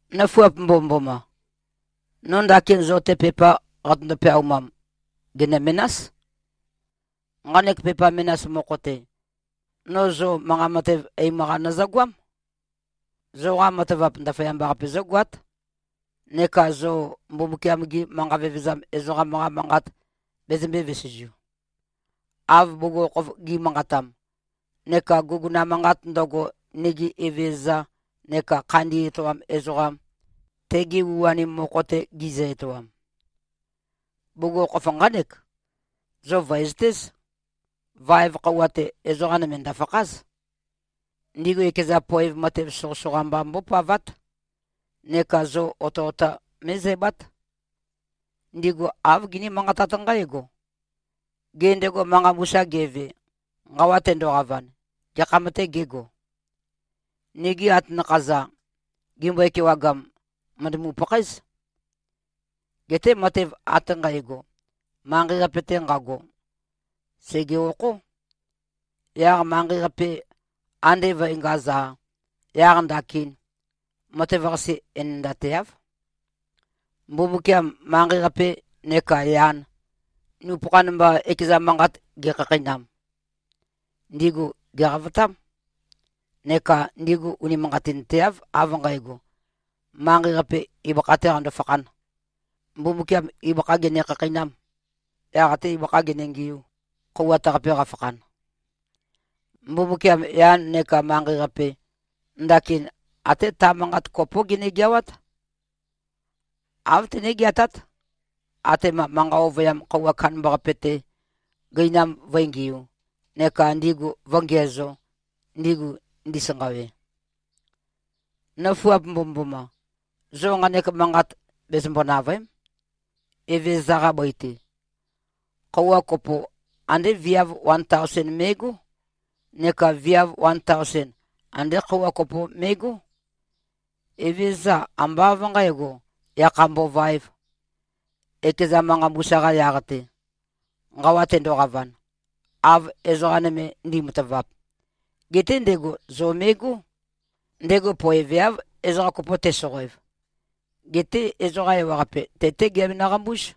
Nøfuap mbomømboma! No ndakin zo-te pepa qatøndo-peaumam, gènø-menás. Nqanek pepa menas mokho-te, no zo manqa matev eim-qa nøzøgoám. Zoqa matavap, ndaføyamba-qape zǿgoát, neka zo Mbumbukiam-gi manqa vevezam ezoqam-qa manqat bezømbē-vesezu, av bugukhokhof gi꞉manqatam, neka guguna manqat ndøgo, nigi Evezøza neka Khandi Etoam Ezoqam, tegi u-anim mokho-te, gizø-etoam. Bugukhokhof nqánek: Zo vø̀ezøtéz. Vaev khøuwa-te, ezoqa nøme ndø̀fakház. Ndigu ekeza poev matev soqøsoqa mba mbópavát. Neka zo otøota mé꞉zæbát. Ndigu āv giní-manqatát nqǽgo, “Gê, ndego manqa mbusa geve, nqawa tendoqavan, gekham-tê gego? Nigi atanakha-za, gimbøe-kewagam, mø̀ndømu-pakhaéz. Geté matev ate nqægo, manqei-qape-te nqago, sège-okhó. Yaq manqei-qape ande vø̄engaz-a, yaq ndakin, matev-qase enendateáv.” Mbumbukiam manqei-qape neka yan, nupøkhan mba, ekeza manqat ge꞉khakheinam, ndigu gèqavotám. Neka ndigu unimanqatinteáv, av nqægo, manqei-qape ibøkha-tē qando-fakhān; Mbumbukiam ibøkhā gene-khakheinām, yaq atē ibøkhā gene-ngiū, khøuwat-qape qafakhan. Mbumbukiam yan neka manqei-qape, ndakin até ta manqat kopó genegeawát. Āv tené-geatát, atema manqa ovøyam khøuwa kandambaqape-te, gøinam vǿengiū, neka ndigu vǿngiæzō, ndigu ndisanqawe. Nøfuap mbomømboma! Zo nqanek manqat bezømbo-nàvøe᷄m: Evezøza-qa bøi-te, khøuwa kopo andé viav wan taosen me꞉gó, neka viav wan taosen, andé khøuwa kopo me꞉gó. Evezøza ambá av nqǣgo, yakha mbovaēv, ekeza manqa mbusa-qa yaq-te, nqawa tendoqavan, av ezoqa nøme ndi꞉matavap. Geté ndego zo me꞉gó. Ndego poeveáv, ezoqa kopo tesoqoev. Geté ezoqa ewaqape, te-té giabenø-qambúz.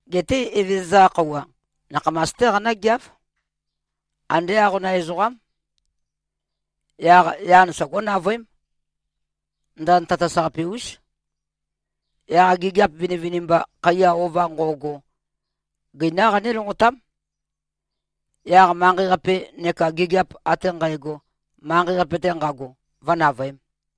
Geté Evezøza-qa Khøuwa, nakhamas-té qanǿgeáv. Andé aqonam ezoqám. Yaq yan sogó-navøém. Ndand tatas-qape-ús. Yaq gigiap vinivinimba, khaiya ova nqo꞉go, gøinám qané-lonqotám. Yaq manqei-qape neka gigiap ate nqægo, manqei-qape-te nqago, vǿnavøēm.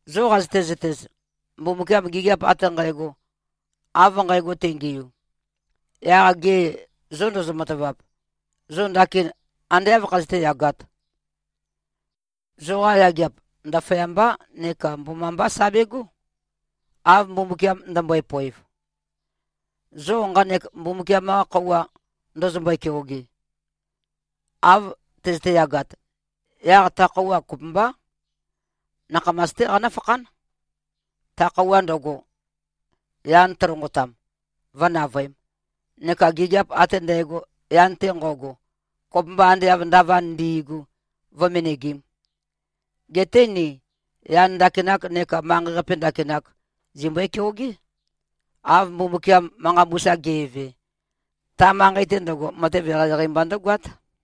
Zo qazøte-zøtez, Mbumbukiam gigiap ate nqægo, av nqægo tengiu, yaq ge zô ndozo-matavap, zo ndakin ande áv khazøté-yagāt? Zoqa yageap, ndaføyambá neka mbomambá sa begó, av Mbumbukiam ndømbøe-poev, zo nqanek Mbumbukiam-qa khøuwa ndøzømbøe-keoge. Av tøzøte-yagat, yaq ta khøuwa kopømbá, nakhamas-té qanǿfakhán, ta khøuwa ndøgo, yan tølonqotam, vǿnavøēm, neka gigiap ate ndægo, yan-te nqo꞉go, kopømba ande av ndavand ndi꞉gu, vǿ-menegīm. Geté ni yan ndakinak neka manqei-qape ndakinak zimbøe-keogé, av Mbumbukiam manqa mbusa ge꞉ve. Ta manqei-te ndøgo, matev eqeieqei mba ndǿgoát.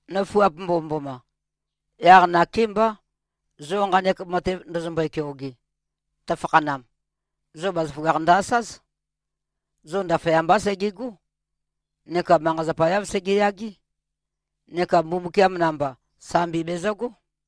Nøfuap mbomømboma! Yaq nakémbá, zo nqanek matev ndøzømbøe-keoge, tøfakhanam, zo bazaføgakh ndø-asáz: Zo ndaføyambá segegó neka manqa-zapa-yáv segeyagé neka Mbumbukiam namba, sambi bezøgó.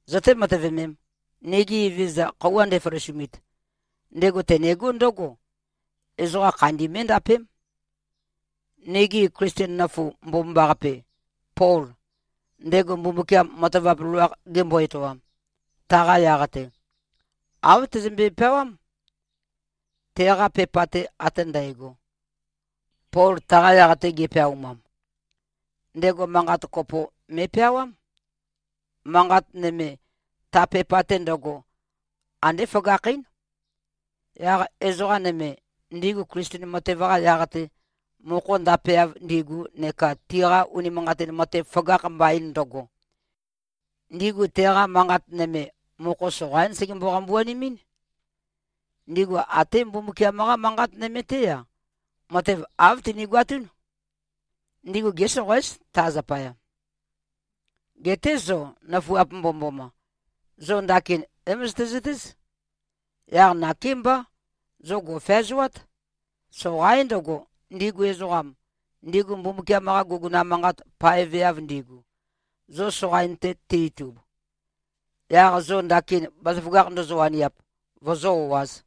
Zøté-matøvemēm! Nigi Evezøza khøuwa ndeføløsumit, ndego tenegó ndǿgo: Ezoqa khandi mé꞉ndapém. Nigi Klisten nøfu mbomambaqape, Pol, ndego Mbumbukiam matavap loloakh gembo-etoam, taqa yaq-te, āv tezømbe-peawám. Teqa pepa-te ate ndægo, Pol taqa yaq-te ge꞉peaumam, ndego manqat kopo me꞉peawám. Manqat nøme, ta pepa-te ndøgo, andé føgakhín. Yaq ezoqa nøme, ndigu Klisten matev-qa yaq-te mokho ndapeav ndigu neka tiqa unimanqatin matev føgakh mbain ndøgo, ndigu teqa manqat nøme, mokho soqaín segembo-qambuanemɨ́n. Ndigu até Mbumbukiam-qa Manqat nøme-té-a, matev āv tinigoatún. Ndigu gésoqoéz, ta zapaya. Geté zo, nøfuap mbomømboma, zo ndakin é-møzøtezøtéz. Yaq nakémbá, zo gò꞉feazoát. Soqaín ndøgo, ndigu ezoqam, ndigu Mbumbukiam-qa guguna manqat paeveav ndigu, zo soqain-te ti-itub, yaq zo ndakin bazaføgakh ndozo-waniap, vozó-o꞉āz.